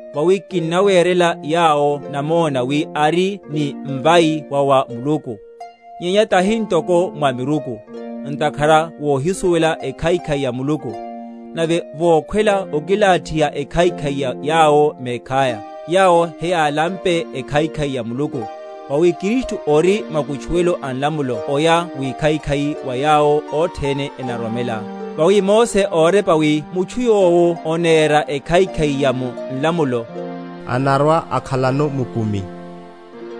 Vawi kinnawerela yawo namona wi ari ni mvai wa wa Muluku, nyenya tahi ntoko mwa miruku. Ntakhara vohisuwela ekhaikhai ya Muluku, nave vokhwela okilathiha ekhaikhai ya yawo mekhaya, yawo heyálampe ekhaikhai ya Muluku. Vawi Kristu ori makutchuwelo a nlamulo oya wikhaikhai wa yawo othene enaroromela. Vawi Mose órepa, wi mutchu yowo onera ekhaikhai ya mu nlamulo, anarwa‐akhalano mukumi.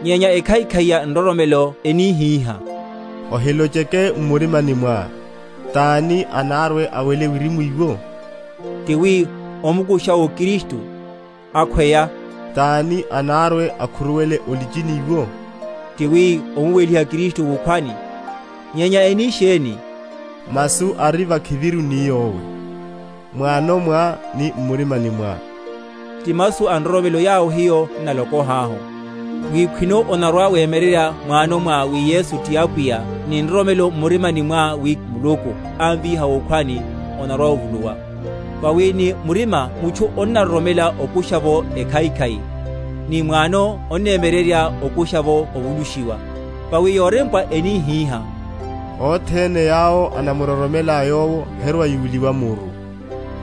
Nyenya ekhaikhai ya nroromelo enihihá, Ohilocheke m’murima mwá, Tani anarwe‐awele wirimu iwo? ti wi, omukurusha’wo Kristu; akhweya, Tani anarwe‐akhuruwele o’lichini iwo? ti wi, omuweliha Kristu wukhwani. Nyenya eni sheni? Masu ari vakhiviru ni yowe, m’wano mwá, ni m’murimani mwá; ti masu a nroromelo, yawo hiyo n’nalokohahu: wi khwino onarwa‐wemyererya m’wano mwá wi Yesu, ti Apwiya, ni nroromelo m’murimani mwá wi Muluku ámvíha wukhwani, onarwa‐ovuluwa: vawi ni murima mutchu onnaroromela okusha’vo ekhaikhai; ni m’wano onnemyererya okusha’vo ovulushiwa. Vawi yorempwa enihiha, Othene yawo enamuroromela Yowo herwa‐yuliwa muru.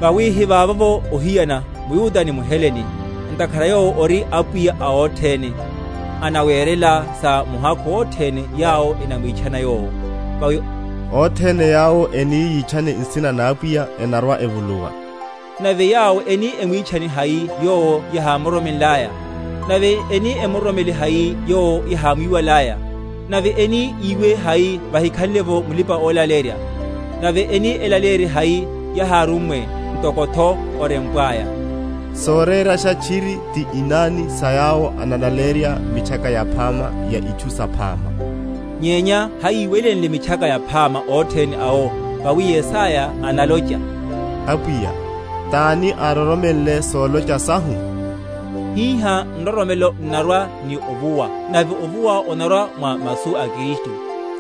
Vawi hivavovo ohiyana mYuda ni mHelene; ntakhara Yowo ori Apwiya a othene, anawerela sa muhakhu othene yawo enamwitchana Yowo; vawi, Othene yawo eni yitchane nsina na Apwiya enarwa‐evuluwa. Nave yawo eni emwitchane hai Yowo yahámuroromenlaya? Nave eni emuroromele hai Yowo yahámwiwalaya? Nave eni yiwe hai vahikhanle’vo mulipa‐olaleyerya? Nave eni elaleyerye hai, yáhirummwe? Ntokotho orempwaya, Sorerasha tchiri ti inani sa yawo enalaleyerya Mitchaka Yaphama ya itchu saphama. Nyenya hayíwelenle Mitchaka Yaphama othene awo. Vawi Yesaya analocha, Apwiya, tani ároromenle solocha sahu? Hihá nroromelo n’narwa ni ovuwa, nave ovuwa onarwa mwa masu a Kristu.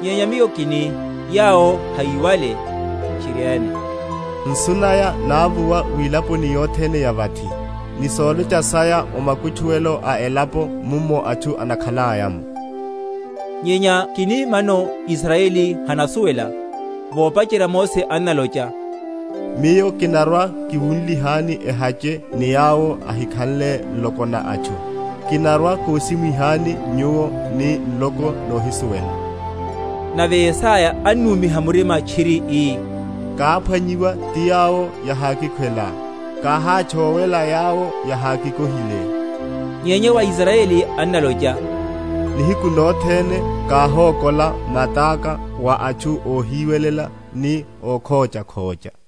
Nyenya miyo kini, Yawo hayíwale? Tchiriene, Nsu naya návuwa wilaponi yothene ya vathi, Ni solocha saya o makutchuwelo a elapo mummo atchu enakhalaya’mo. Nyenya kini, Mano Israyeli hanasuwela? Vopacherya Mose annalocha, Miyo kinarwa‐kiwunlihani ehache ni yawo ehikhanle nloko na atchu, Kinarwa‐koshiniwihani nyuwo ni nloko nohísuwela. Nave Yesaya annúmiha murima tchiri, ii, Káphwanyiwa ti yawo yahákikhwela; Káhátchówela yawo yahákikohile. Nyenya wa Israyeli annalocha, Nihiku nothene káhókola mataka wa atchu óhiwelela ni ókhóchakhócha.